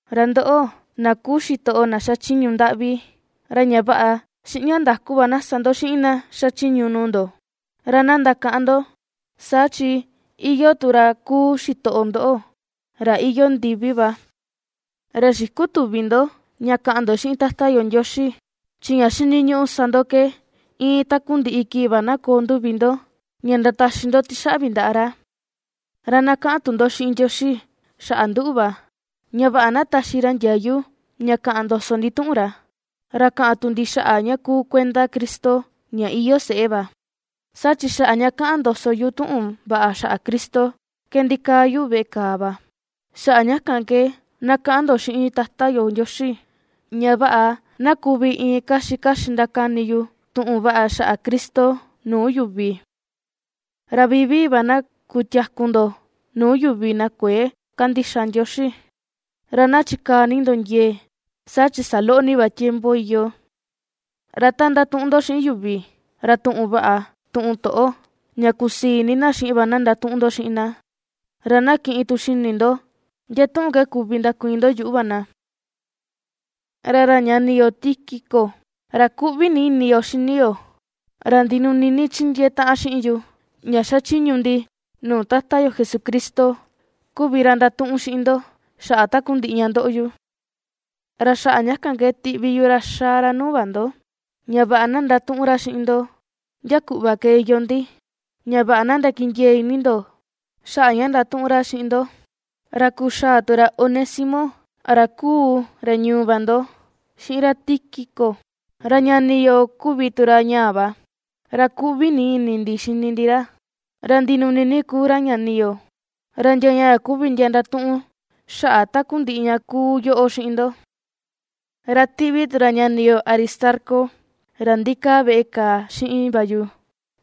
Ra ndoꞌo, na kuu xitoꞌo na xachiñu ndaꞌvi, ra ña vaꞌa, xiꞌin ña ndaku va na sa ndo xiꞌin na xachiñu nuu ndo. Ra na ndakaꞌan ndo, saa chi iyoo tu ra kuu xitoꞌo ndoꞌo, ra iyoo ndivi va. Ra xikutüvi ndo ña kaꞌan ndo xiꞌin Tata yo Ndioxi, chi ña xiniñuꞌu sa ndo ke iin takundiꞌi va kii na koo nduvi ndo ña ndataxi ndo tixaꞌvi ndaꞌa ra. Ra na kaꞌan tu ndo xiꞌin Ndioxi xaꞌa nduꞌu va, ña vaꞌa na taxi ra ndiayu ña kaꞌan ndoso ndi tuꞌun ra, ra kaꞌan tu ndi xaꞌa ña kuu kuenda Cristo ña iyoo seꞌe va, saa chi xaꞌa ña ^kaꞌan ndoso yu tuꞌun vaꞌa xaꞌa Cristo ke ndikaa yu veꞌe kàà va. Xaꞌa ña kan ke na kaꞌan ndo xiꞌin Tata yo Ndioxi, ña vaꞌa na kuvi iin kaxi kaxi ndakani yu tuꞌun vaꞌa xaꞌa Cristo nuu yuvi. Ra vivii va na kutiaku ndo nuu yuvi na kuëe kandixa Ndioxi, ra na chikaa ni ndo ndiee, saa chi saloꞌo ni va tiempo iyoo. Ra ta ndatuꞌun ndo xiꞌin yuvi, ra tuꞌun vaꞌa, tuꞌun toꞌo ña kusii ini na xiꞌin va na ndatuꞌun ndo xiꞌin na, ra na kiꞌin tu xini ndo ndia tuꞌun ke kuvi ndakuiin ndo yuꞌu va na. Ra ra ñani yo Tíquico, ra kuꞌvi ni ini yo xini yo, ra ndinuni ni chindiee taꞌan xiꞌin yu ña xachiñu ndi nuu Tata yo Jesucristo kuvi ra ndatuꞌun xiꞌin ndo xaꞌa takundiꞌi ña ^ndoꞌo yu. Ra xaꞌa ña kan ke tiꞌvi yu ra xaa ra nuu va ndo, ña vaꞌa na ndatuꞌun ra xiꞌin ndo ndia kuꞌva ke iyoo ndi, ña vaꞌa na ndakindiee ini ndo xaꞌa ña ndatuꞌun ra xiꞌin ndo. Ra kuxaa tu ra Onésimo, ra kuu ra ñuu va ndo xiꞌin ra Tíquico, ra ñani yo kuvi tu ra ñaa va, ra kuꞌvi ni ini ndi xini ndi ra, ra ndinuni ni kuu ra ñani yo. Ra ndia ñaa kuvi ndia ndatuꞌun xaꞌa takundiꞌi ña ^kuu yoꞌo xiꞌin ndo. Ra ^tiꞌvi tu ra ñani yo Aristarco, ra ndikaa veꞌe kàà xiꞌin va yu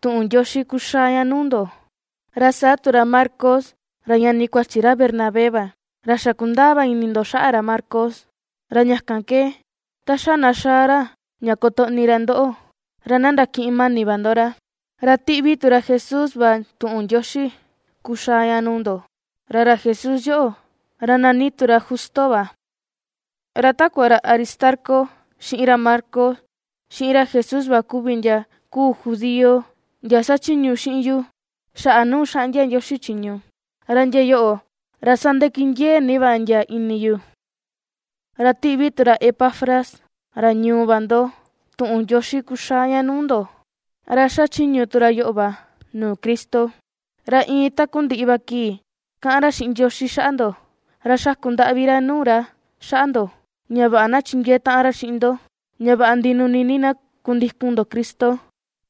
tuꞌun ndioxi kuxaa ña nuu ndo, ra saa tu ra Marcos, ra ñani kuachi ra Bernabé va. Ra xa kundaa va ini ndo xaꞌa ra Marcos; ra ña kan ke, ta xa na xaa ra ña kotoꞌni ra ndoꞌo, ra na ndakiꞌin mani va ndo ra. Ra ^tiꞌvi tu ra Jesús va tuꞌun ndioxi kuxaa ña nuu ndo, ra ra Jesús yoꞌo, ra nani tu ra Justo va. Ra takua ra Aristarco, xiꞌin ra Marcos, xiꞌin ra Jesús va kuvi ndia kuu judío ndia xachiñu xiꞌin yu xaꞌa nuu xaꞌndia Ndioxi chiñu, ra ndia yoꞌo, ra sandakindiee ni va ndia ini yu. Ra ^tiꞌvi tu ra Epafras, ra ñuu va ndo tuꞌun ndioxi kuxaa ña nuu ndo, ra ^xachiñu tu ra yoꞌo va nuu Cristo. Ra iin takundiꞌi va kii kaꞌan ra xiꞌin Ndioxi xaꞌa ndo, ra xaku ndaꞌvi ra nuu ra xaꞌa ndo, ña vaꞌa na chindiee taꞌan ra xiꞌin ndo, ña vaꞌa ndinuni ni na kundikun ndo Cristo,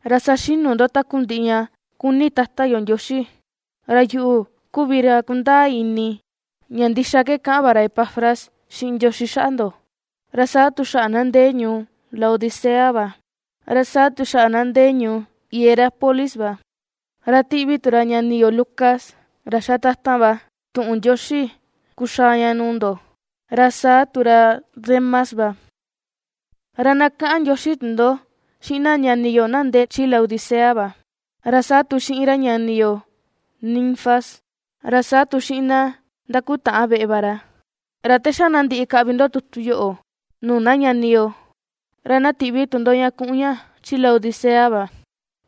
ra saxinu ndo takundiꞌi ña kuni Tata yo Ndioxi. Ra yuꞌu kuvi ra kundaa ini ña ndixa ke kaꞌan va ra Epafras xiꞌin Ndioxi xaꞌa ndo, ra saa tu xaꞌa na ndee ñuu Laodicea va, ra saa tu xaꞌa na ndee ñuu Hierápolis va. Ra tiꞌvi tu ra ñani yo Lucas, ra xa tatan va, tuꞌun ndioxi kuxaa ña nuu ndo, ra saa tu ra Demas va. Ra na kaꞌan ndioxi tu ndo xiꞌin na ñani yo na ndee chi Laodicea va. Ra saa tu xiꞌin ra ñani yo Ninfas, ra saa tu xiꞌin na ndakutaꞌan veꞌe va ra. Ra ta xa na ndiꞌi kaꞌvi ndo tutu yoꞌo, nuu na ñani yo, ra na tiꞌvi tu ndo ña kuꞌun ña chi Laodicea va,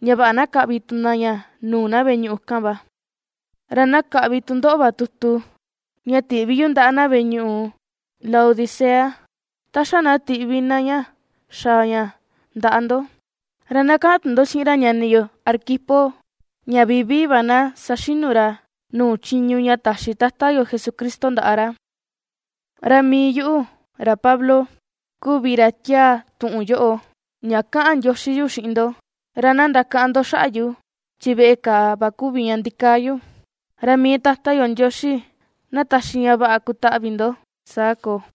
ña vaꞌa na kaꞌvi tu na ña nuu na veꞌe ñuꞌu kan va; ra na kaꞌvi tu ndoꞌo va tutu, ña tiꞌvi yu ndaꞌa na veꞌe ñuꞌu Laodicea, ta xa na tiꞌvi na ña xaa ña ndaꞌa ndo. Ra na kaꞌan tu ndo xiꞌin ra ñani yo Arquipo ña vivii va na saxinu ra nuu chiñu ña taxi Tata yo Jesucristo ndaꞌa ra. Ra mii yuꞌu, ra Pablo, kuvi ra tiaa tuꞌun yoꞌo, ña kaꞌan ndioxi yu xiꞌin ndo. Ra na ndakaꞌan ndo xaꞌa yu chi veꞌe kàà va kuvi ña ndikaa yu. Ra mii Tata yo Ndioxi na taxi ña vaꞌa kutaꞌvi ndo. Saa koo.